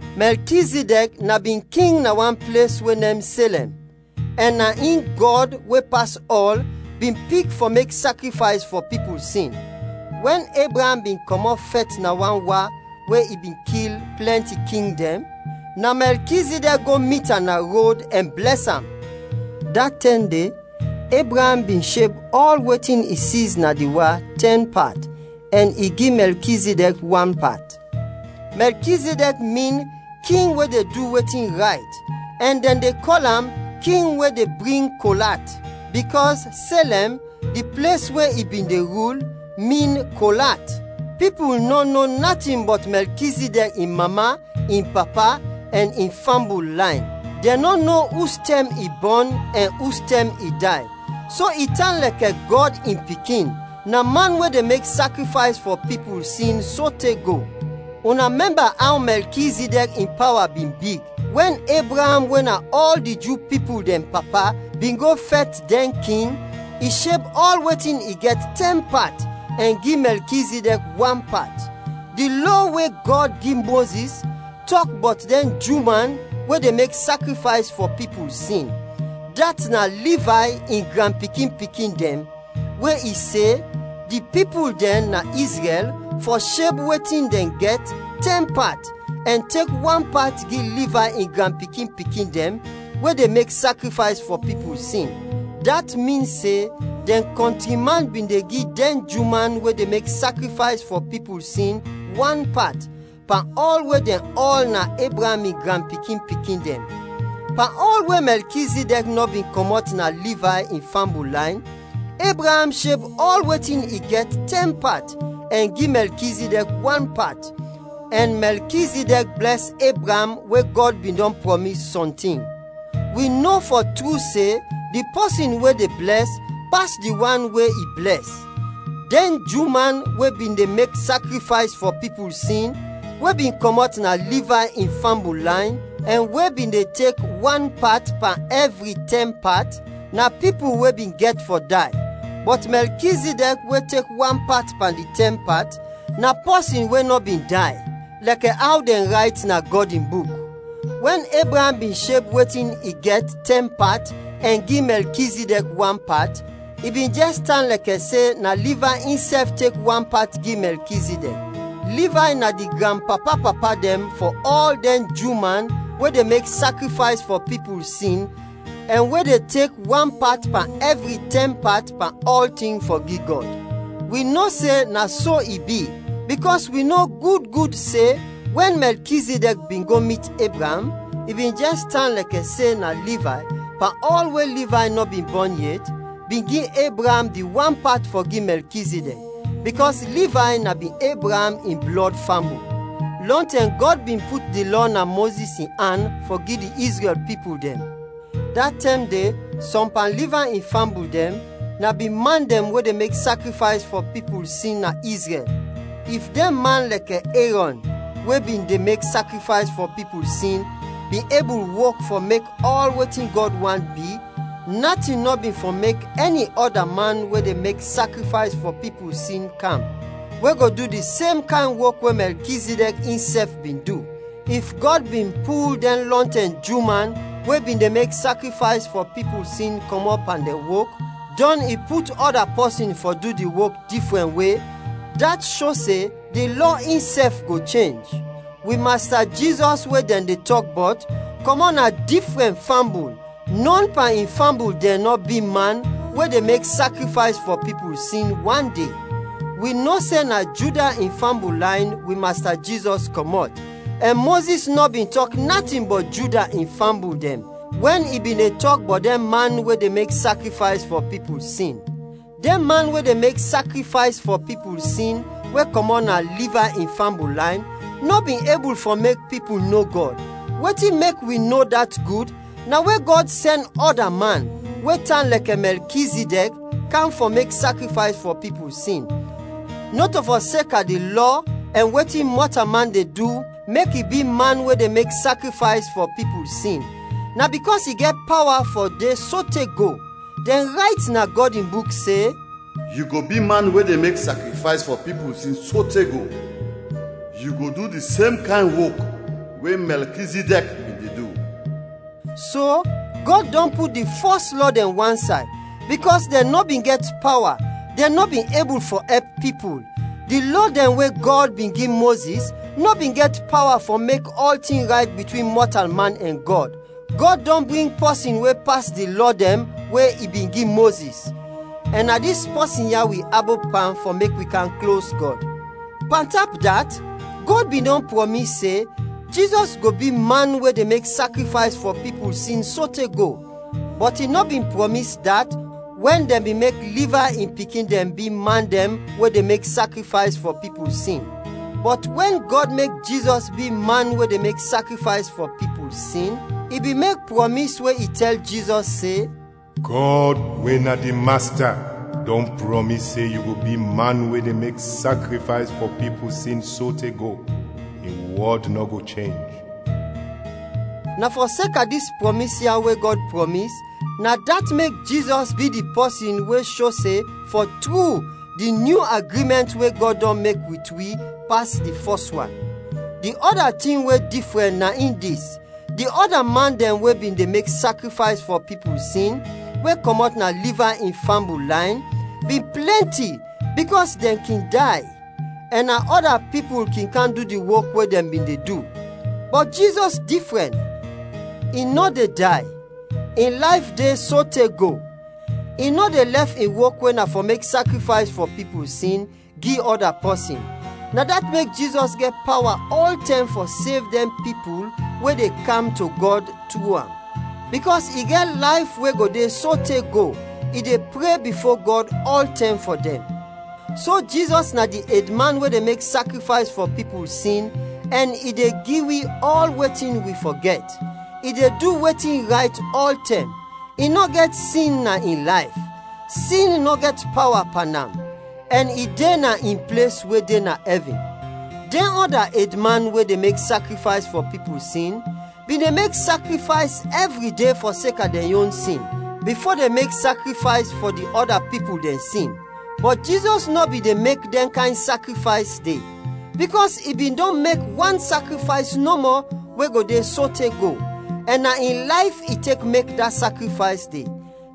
Mɛlkizidɛk na bin king na wan ples we nem Selɛm ɛn na in Gɔd, we pas ɔl, bin pik fɔ mek sakrifays fɔ pipul sin. Wɛn Ebraam bin kɔmɔt fɛt na wan wa we i bin kil plɛnti king dɛn, na Mɛlkizidɛk go mit am na rod ɛn blɛs am. Da tɛm de, Ebraam bin sheb ɔl wetin i siz na di wa, tɛn pat, ɛn i gi Mɛlkizidɛk wan pat. Mɛlkizidɛk min, “King we de du wetin rayt;” ɛn dɛn de kɔl am, “King we de bring kol at,” bikɔs Selɛm, di ples we i bin de rul, min “Kol at.” Pipul nɔ no natin bɔt Mɛlkizidɛk in mama, in papa ɛn in fambul layn. Dɛn nɔ no ustɛm i bɔn ɛn ustɛm i day. So i tan lɛkɛ Gɔd in Pikin: na man we de mek sakrifays fɔ pipul sin, sote go. Una mɛmba aw Mɛlkizidɛk in pawa bin big. Wɛn Ebraam we na ɔl di Ju pipul dɛn papa bin go fɛt dɛn king, i sheb ɔl wetin i gɛt tɛn pat ɛn gi Mɛlkizidɛk wan pat. Di Lɔ we Gɔd gi Mozis tɔk bɔt dɛn Ju man we de mek sakrifays fɔ pipul sin, dat na Livay in granpikin-pikin dɛn, we i se, di pipul dɛn na Izrɛl fɔ sheb wetin dɛn gɛt, tɛn pat, ɛn tek wan pat gi Livay in granpikin-pikin dɛn we de mek sakrifays fɔ pipul sin. Dat min se dɛn kɔntri man bin de gi dɛn Ju man we de mek sakrifays fɔ pipul sin, wan pat, pan ɔl we dɛn ɔl na Ebraam in granpikin-pikin dɛn. Pan ɔl we Mɛlkizidɛk nɔ bin kɔmɔt na Livay in fambul layn, Ebraam sheb ɔl wetin i gɛt tɛn pat ɛn gi Mɛlkizidɛk wan pat, ɛn Mɛlkizidɛk blɛs Ebraam we Gɔd bin dɔn prɔmis sɔntin. Wi no fɔ tru se, di pɔsin we de blɛs pas di wan we i blɛs. Dɛn Ju man we bin de mek sakrifays fɔ pipul sin we bin kɔmɔt na Livay in fambul layn ɛn we bin de tek wan pat pan ɛvri tɛn pat, na pipul we bin gɛt fɔ day; bɔt Mɛlkizidɛk we tek wan pat pan di tɛn pat, na pɔsin we nɔ bin day, lɛkɛ aw dɛn rayt na Gɔd in Buk. Wɛn Ebraam bin sheb wetin i gɛt tɛn pat ɛn gi Mɛlkizidɛk wan pat, i bin jɛs tan lɛkɛ se na Livay insɛf tek wan pat gi Mɛlkizidɛk. (Livay na di granpapa-papa dɛn fɔ ɔl dɛn Ju man we de mek sakrifays fɔ pipul sin ɛn we de tek wan pat pan ɛvri tɛn pat pan ɔltin fɔ gi Gɔd.) Wi no se na so i bi, bikɔs wi no gud gud se, wɛn Mɛlkizidɛk bin go mit Ebraam, i bin jɛs tan lɛkɛ se na Livay, pan ɔl we Livay nɔ bin bɔn yet, bin gi Ebraam di wan pat fɔ gi Mɛlkizidɛk, bikɔs Livay na bin Ebraam in blɔd fambul. Lɔntɛm Gɔd bin put di Lɔ na Mozis in an fɔ gi di Izrɛl pipul dɛn, da tɛm de sɔm pan Livay in fambul dɛn na bin man dɛn we de mek sakrifays fɔ pipul sin na Izrɛl. If dɛn man lɛkɛ Erɔn we bin de mek sakrifays fɔ pipul sin, bin ebul wok fɔ mek ɔl wetin Gɔd want bi, natin nɔ bin fɔ mek ɛni ɔda man we de mek sakrifays fɔ pipul sin kam, we go du di sem kayn wok we Mɛlkizidɛk insɛf bin du. If Gɔd bin pul dɛn lɔntɛm Ju man we bin de mek sakrifays fɔ pipul sin kɔmɔt pan dɛn wok, dɔn i put ɔda pɔsin fɔ du di wok difrɛn we, dat sho se di lɔ insɛf go chenj. Wi Masta Jizɔs we dɛn de tɔk bɔt, kɔmɔt na difrɛn fambul; nɔn pan in fambul dɛn nɔ bi man we de mek sakrifays fɔ pipul sin, wande. Wi no se na Juda in fambul layn wi Masta Jizɔs kɔmɔt; ɛn Mozis nɔ bin tɔk natin bɔt Juda in fambul dɛn wɛn i bin de tɔk bɔt dɛn man we de mek sakrifays fɔ pipul sin. Dɛn man we de mek sakrifays fɔ pipul sin we kɔmɔt na Livay in fambul layn, nɔ bin ebul fɔ mek pipul no Gɔd. Wetin mek wi no dat gud, na we Gɔd sɛn ɔda man, we tan lɛkɛ Mɛlkizidɛk, kam fɔ mek sakrifays fɔ pipul sin. Nɔto fɔseka di lɔ ɛn wetin mɔtalman de du mek i bi man we de mek sakrifays fɔ pipul sin, na bikɔs i gɛt pawa fɔ de sote go. Dɛn rayt na Gɔd in Buk se, “Yu go bi man we de mek sakrifays fɔ pipul sin sote go, yu go du di sem kayn wok we Mɛlkizidɛk bin de du.” So, Gɔd dɔn put di fɔs lɔ dɛn wansay, bikɔs dɛn nɔ bin gɛt pawa, dɛn nɔ bin ebul fɔ ɛp pipul. Di Lɔ dɛn we Gɔd bin gi Mozis nɔ bin gɛt pawa fɔ mek ɔltin rayt bitwin mɔtalman ɛn Gɔd. Gɔd dɔn bring pɔsin we pas di Lɔ dɛn we i bin gi Mozis, ɛn na dis pɔsin ya wi abop pan fɔ mek wi kam klos Gɔd. Pantap dat, Gɔd bin dɔn prɔmis se, Jizɔs go bi man we de mek sakrifays fɔ pipul sin sote go, bɔt i nɔ bin prɔmis dat wɛn dɛn bin mek Livay in pikin dɛn bi man dɛn we de mek sakrifays fɔ pipul sin. Bɔt wɛn Gɔd mek Jizɔs bi man we de mek sakrifays fɔ pipul sin, i bin mek prɔmis we i tɛl Jizɔs se, “Gɔd, we na di Masta, dɔn prɔmis se yu go bi man we de mek sakrifays fɔ pipul sin sote go; Mi wɔd nɔ go chenj.” Na fɔseka dis prɔmis ya we Gɔd prɔmis, na dat mek Jizɔs bi di pɔsin we sho se fɔ tru di nyu agrimɛnt we Gɔd dɔn mek wit wi, pas di fɔs wan. Di ɔda tin we difrɛn na in dis: di ɔda man dɛn we bin de mek sakrifays fɔ pipul sin we kɔmɔt na Livay in fambul layn, bin plɛnti bikɔs dɛn kin day, ɛn na ɔda pipul kin kam du di wok we dɛn bin de du. Bɔt Jizɔs difrɛn, i nɔ de day, in layf de sote go. I nɔ de lɛf in wok we na fɔ mek sakrifays fɔ pipul sin, gi ɔda pɔsin. Na dat mek Jizɔs gɛt pawa ɔltɛm fɔ sev dɛn pipul we de kam to Gɔd tru am. Bikɔs i gɛt layf we go de sote go, i de pre bifo Gɔd ɔltɛm fɔ dɛn. So Jizɔs na di edman we de mek sakrifays fɔ pipul sin ɛn i de gi wi ɔl wetin wi fɔ gɛt. I de du wetin rayt ɔltɛm; i nɔ gɛt sin na in layf; sin nɔ gɛt pawa pan am; ɛn i de na in ples we de na ɛvin. Dɛn ɔda edman we de mek sakrifays fɔ pipul sin, bin de mek sakrifays ɛvri de fɔseka dɛn yon sin, bifo dɛn mek sakrifays fɔ di ɔda pipul dɛn sin. Bɔt Jizɔs nɔ bin de mek dɛn kayn sakrifays de, bikɔs i bin dɔn mek wan sakrifays nɔmɔ we go de sote go, ɛn na in layf i tek mek da sakrifays de.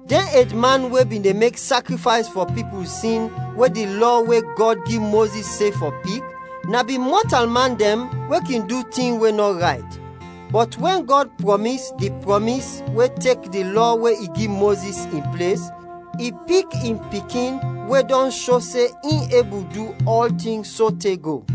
Dɛn edman we bin de mek sakrifays fɔ pipul sin we di Lɔ we Gɔd gi Mozis se fɔ pik, na bin mɔtalman dɛn we kin du tin we nɔ rayt. Bɔt wɛn Gɔd prɔmis di prɔmis we tek di Lɔ we i gi Mozis, in ples, i pik in Pikin we dɔn sho se in ebul du ɔltin sote go.